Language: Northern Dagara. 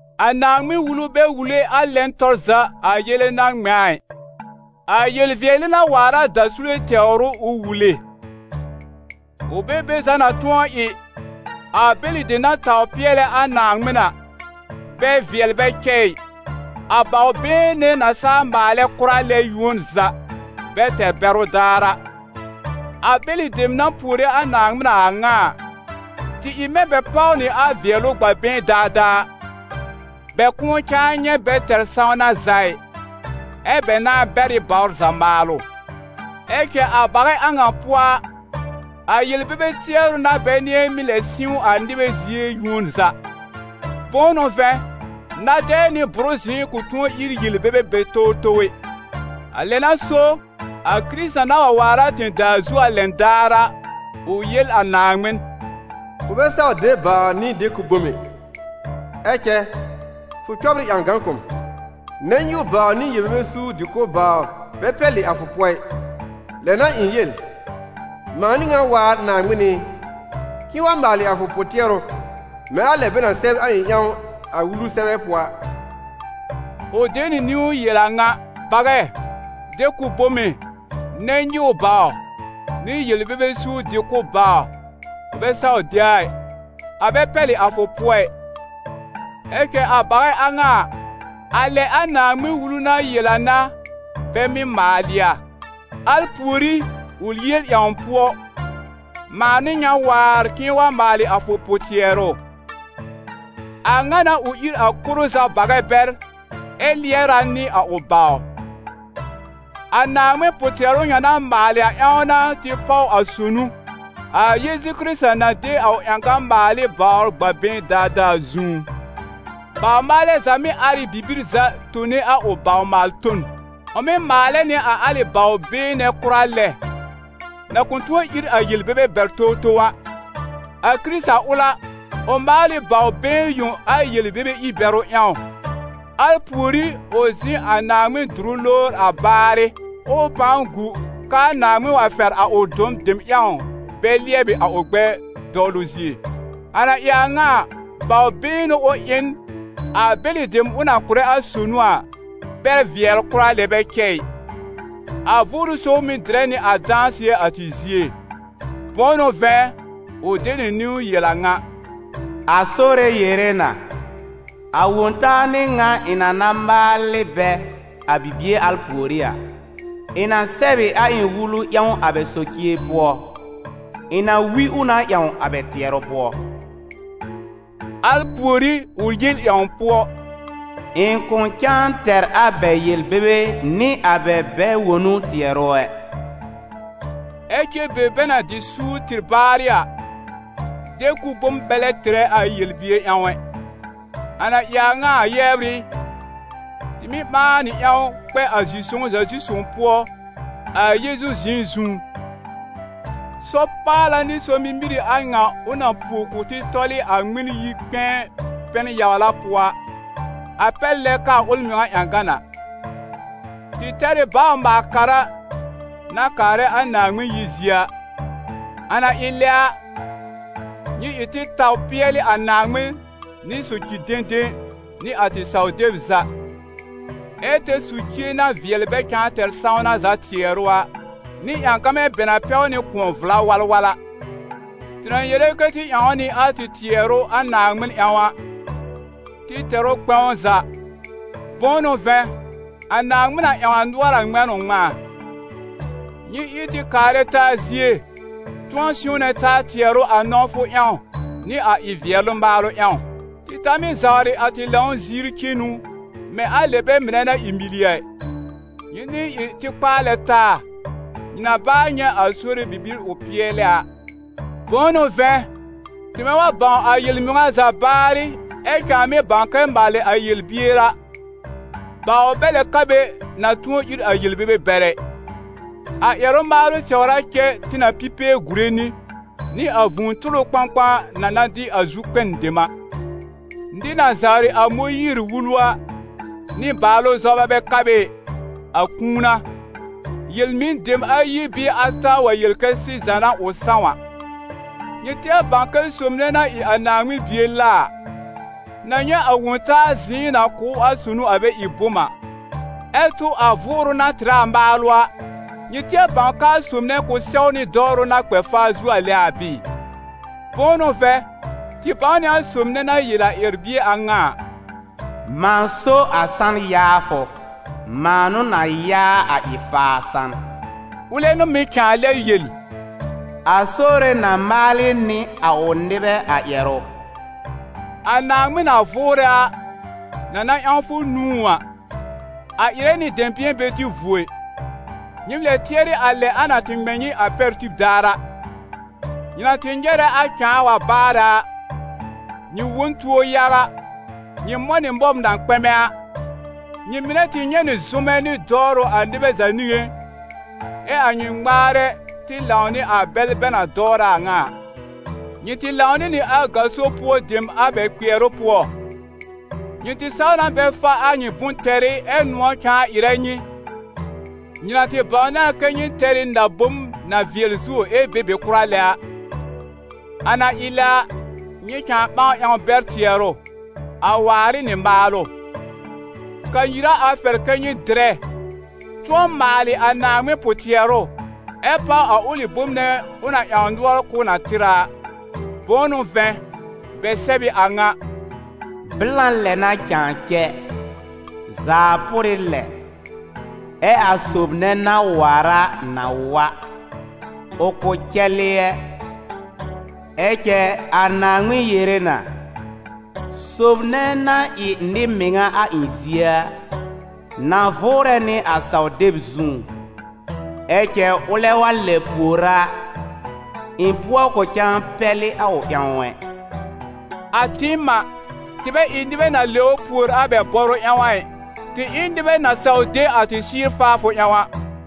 A Naaŋmɩn-Wulu bɛ wule a lɛn tɔr za a yele na ŋmɛ̃ a ɩ; a yel-vɩɛlɩ na waar a dasule tɛwr ʋ ʋ wule. Ʋ bɛ be za na tʋ̃ɔ ɩ, a bɛlɩ dem na tawr pɩɛlɛ a Naaŋmɩn a, bɛ vɩɛl bɛ cɛ ɩ, a bawr-been nɛ na saa maalɛ kʋra lɛ, yuon za, bɛ tɛr bɛrʋ daar a. A bɛlɩ dem, na puore a Naaŋmɩn a a ŋa a, tɩ ɩ mɛ̃ bɛ páw nɩ a vɩɛlʋ gb'a been daadaa a, bɛ kʋ̃ʋ cãa nyɛ̃ bɛ tɛr sãwna za ɩ, ɛ́ bɛ nãá bɛr ɩ bawr za maalʋ. Ɛ cɛ a bagɛ a ŋa pʋɔ a, a yel-bebe tɩɛrʋ n'a bɛ nɩ̃ɛ mɩ́ lɛb sɩ̃w a nɩbɛ zie yuon za. Bʋ̃ʋ n'ʋ vɛ̃, na-dɛɛ nɩ bʋrɩ zɩ̃ɩ kʋ̃ tʋ̃ɔ ír yel-bebe bɛr towtow ɛ. A lɛ n'a so, a Kɩrɩta na wa waar a tẽ-daa zu a lɛn daar a, ʋ yel a Naaŋmɩn: «Fʋ bɛ saw de bawr nɩ de-kʋb bom ɛ, ɛ cɛ fʋ cɔbr ɩ ƴãgan kʋ̀ m. Nɛn-nyɩw bawr nɩ yel-bebe suur-dɩ-kʋ̀b bawr bɛ pɛlɩ a fʋ pʋɔ ɩ. Lɛ n'a ɩ̃ yel: ‹Mãa n'ɩ ŋan waar, Naaŋmɩn ɩ, k'ɩ̃ɩ wa maalɩ a fʋ pʋ-tɩɛrʋ mɛ̃ a lɛ bɛ na sɛb a ɩ̃ ƴãw a Wulu sɛbɛ pʋɔ a.›» Ʋ de nɩ niwn yel a ŋa: «Bagɛ, de-kʋb bome, nɛn-nyɩw bawr, nɩ yel-bebe suur dɩ-kʋ̀b bawr, fʋ bɛ saw de a ɩ, a bɛ pɛlɩ a fʋ pʋɔ ɩ.» Ɛ cɛ a bagɛ a ŋa a, a lɛ a Naaŋmɩn-Wulu na yel a n'a bɛ mɩ́ maalɩ a. Al pùorí, ʋ yel ƴãw pʋɔ: «Mãa n'ɩ ŋan waar k'ɩ̃ɩ wa maalɩ a fʋ pʋ-tɩɛrʋ.» A ŋa n'a ʋ ír a koro za bagɛ bɛr, ɛ lɩɛr a nɩ a ʋ bawr. A Naaŋmɩn pʋ-tɩɛrʋ ŋa na maalɩ a ƴãw n'a tɩ páw a sonu, a Yeezu Kɩrɩta na de a ʋ ƴãgan maal ɩ bawr gb'a been daadaa a zũú. Baw-maalɛ za mɩ́ ar ɩ bibir za tone a ʋ baw-maal-ton; ʋ mɩ́ maalɛ nɩ a alɩ bawr been nɛ kʋra lɛ, na kʋ̃ tʋ̃ɔ ír a yel-bebe bɛr towtow a. A Kɩrɩta ʋl a, ʋ maal ɩ bawr been yõ a yel-bebe ir-bɛrʋ ƴãw, al pùorí ʋ zĩ a Naaŋmɩn dʋrʋ lowr a baarɩ, ɛ ʋ pãa gu k'aa Naaŋmɩn wa fɛr a ʋ dɔ̃ dem ƴãw bɛ lɩɛbɩ a ʋ gbɛɛ dɔwlʋ zie. A na ɩ a ŋa a, bawr been n'ʋ ʋ ɩ n, a bɛlɩ dem ʋ na kʋ̀rɛ a sonu a, bɛ vɩɛl kʋra lɛ bɛ cɛ ɩ. A Vʋʋrʋ Sõw mɩ̀ dɩrɛ nɩ a dãsɩɛ a tɩ zie. Bʋ̃ʋ n'ʋ vɛ̃, ʋ de nɩ niwn yel a ŋa: «A Sore yere na: a Wõ-taa n'ɩ ŋa ɩ̃ na na maal ɩ bɛ, a bibie al pùorí a: ɩ̃ na sɛb ɩ a ɩ̃ Wulu ƴãw a bɛ socie pʋɔ, ɩ̃ na wi ʋ na ƴãw a bɛ tɩɛrʋ pʋɔ.» Al pùorí ʋ yel ƴãw pʋɔ: «Ɩ̃ kʋ̃ cãa tɛr a bɛ yel-bebe nɩ a bɛ bɛ-wonu tɩɛrʋ ɛ.» Ɛ cɛ be bɛ na dɩ suur tɩr baarɩ a, de-kʋb bom bɛ lɛb tɩrɛ a yel-bier ƴãw ɛ. A na ɩ a ŋa a, yɛbr ɩ, tɩ mɩ́ ɓãa nɩ ƴãw kpɛ a zi-sõw-za-zi-sõw pʋɔ a Yeezu zɩ̃ɩ zũú. Sɔr-paala nɩ sɔr-mimir ɩ a ŋa ʋ na puo kʋ̀ tɩ tɔl ɩ a Ŋmɩn-yi-kpɛ̃ɛ pɛn-yawla pʋɔ a, a pɛr lɛ k'aa ʋl mɩŋa ƴãgan a. Tɩ tɛr ɩ bawr-maal-kara na kaarɛ a Naaŋmɩn yir zie a. A na ɩ lɛ a, nyɩ ɩ tɩ taw pɩɛlɩ a Naaŋmɩn nɩ soci-dẽdẽ nɩ a tɩ saw-deb za, ɛ tɛr socie na vɩɛl bɛ cãa tɛr sãwna za tɩɛrʋ a, nɩ ƴãgamɛ bɛ na pɛw nɩ kʋ̃ɔ vla walwal a. Tɩ na yere kɛ́ tɩ ƴãw nɩ a tɩ tɩɛrʋ a Naaŋmɩn ƴãw a, tɩ tɛr ʋ kpɛ̃w za, bʋ̃ʋ n'ʋ vɛ̃, a Naaŋmɩn na ƴãw a nʋɔr a ŋmɛ̃ n ʋ ŋmɛ̃a. Nyɩ ɩ tɩ kaarɛ taa zie, tʋ̃ɔ sɩ̃wnɛ taa tɩɛrʋ a nɔ̃wfʋ ƴãw nɩ a ɩ-vɩɛlɩ maalʋ ƴãw. Tɩ ta mɩ́ zawrɩ a tɩ lãw ziir cenu mɛ̃ a lɛ bɛ mɩnɛ na ɩ mili a ɩ; nyɩ nɩ̃ɛ ɩ tɩ kpaalɛ taa, nyɩ na baa nyɛ̃ a Sore bibir ʋ pɩɛlɛ a. Bʋ̃ʋ n'ʋ vɛ̃, tɩmɛ wa bãw a yel-mɩŋa za baarɩ, ɛ cãa mɩ́ bãw kɛ maalɩ a yel-bier a, bawr bɛ lɛ ka be na tʋ̃ɔ ír a yel-bebe bɛr ɛ. A ƴɛrʋ-maalʋ tɛwr a cɛ tɩ na pi pee gùre nɩ, nɩ a vũu tʋlʋ kpãkpã na na dɩ a zu-kpɛn dem a. Nɩr na zawrɩ a Mõyiir-Wulu a, nɩ-baalʋ zɔba bɛ ka be ɩ, a kũu n'a: yel-mɩn-dem ayi bɩɩ ata wa yel kɛ sɩza n'a ʋ sãw a. Nyɩ tɩɛr bãw kɛ sob nɛ na ɩ a Naaŋmɩn Bie la a, na nyɛ̃ a Wõ-taa zɩ̃ɩ na kʋ̀ ʋ a sonu a bɛ ɩ bom a, ɛ tʋ a Vʋʋrʋ na tɩrɛ a maalʋ a, nyɩ tɩɛr bãw k'aa sob nɛ kʋ̃ sɛwnɩ dɔwrʋ na kpɛ faa zuo lɛ a bɩɩ? Bʋ̃ʋ n'ʋ vɛ̃, tɩ bãw nɩ a sob nɛ na yel a ƴɛr-bie a ŋa a: «Mãa so a san yaafʋ, mãa n'ʋ na yaa a ɩ-faa san», ʋlɛ n'ʋ mɩ̀ cãa lɛ yel: «A Sore na maalɩ nɩ a ʋ nɩbɛ a ƴɛrʋ.» A Naaŋmɩn na vʋʋrɛ a, na na ƴãw fʋ nũú a, a ɩrɛ nɩ dɛ̃bɩ̃ɛ bɛ dɩ vuo ɩ! Nyɩ lɛb tɩɛrɩ a lɛ a na tɩ ŋmɛ̃ nyɩ a pɛr tib daar a: nyɩ na tɩ nyɛrɛ a cãa wa baarɛ a, nyɩ wõ n tuo yaga, nyɩ mɔ̃ nɩ mɔb na kpɛmɛ a. Nyɩ mɩnɛ tɩ nyɛ̃ nɩ zʋmɛ nɩ dɔwrʋ a nɩbɛ za niŋé, ɛ a nyɩ ŋmaarɛ tɩ lãw nɩ a bɛl bɛ na tɩ dɔwrɛ a a ŋa a. Nyɩ tɩ lãw nɩ nɩ a gaso pʋɔ dem a bɛ kpɩɛrʋ pʋɔ, nyɩ tɩ saw na bɛ fa a nyɩ bʋ̃-tɛrɩ ɛ nʋ̃ɔ̀ cãa ɩrɛ nyɩ, nyɩ na tɩ bãwnɩ a kɛ́ nyɩ tɛr ɩ na-bom na vɩɛl zuo ɛ be be kʋra lɛ a. A na ɩ lɛ a, nyɩ cãa ɓãa ƴãw bɛr tɩɛrʋ, a waar ɩ nɩ maalʋ. Kanyir a a fɛr kɛ́ nyɩ dɩrɛ, tʋ̃ɔ maalɩ a Naaŋmɩn pʋ-tɩɛrʋ ɛ páw a ʋlɩ bom nɛ ʋ na ƴãw nʋɔr k'ʋʋ na tɩr a a. Bʋ̃ʋ n'ʋ vɛ̃, bɛ sɛb ɩ a ŋa: «Blã lɛ n'a cãa cɛ, zaa pʋrɩ lɛ, ɛ a sob nɛ na waar a na wa, ʋ kʋ̃ cɛlɩ ɛ. Ɛ cɛ a Naaŋmɩn yere na: Sob nɛ na ɩ nɩ-mɩŋa a ɩ̃ zie a, na vʋʋrɛ nɩ a saw-deb zũú, ɛ cɛ ʋlɛ wa lɛb pùor a, ɩ̃ pʋɔ kʋ̃ cãa pɛlɩ a ʋ ƴãw ɛ.» A tɩɩm a, tɩ bɛ ɩ nɩbɛ na lɛbr pùor a bɛ bɔrʋ ƴãw a ɩ, tɩ ɩ n nɩbɛ na saw de a tɩ sɩ́ɩr faafʋ ƴãw a.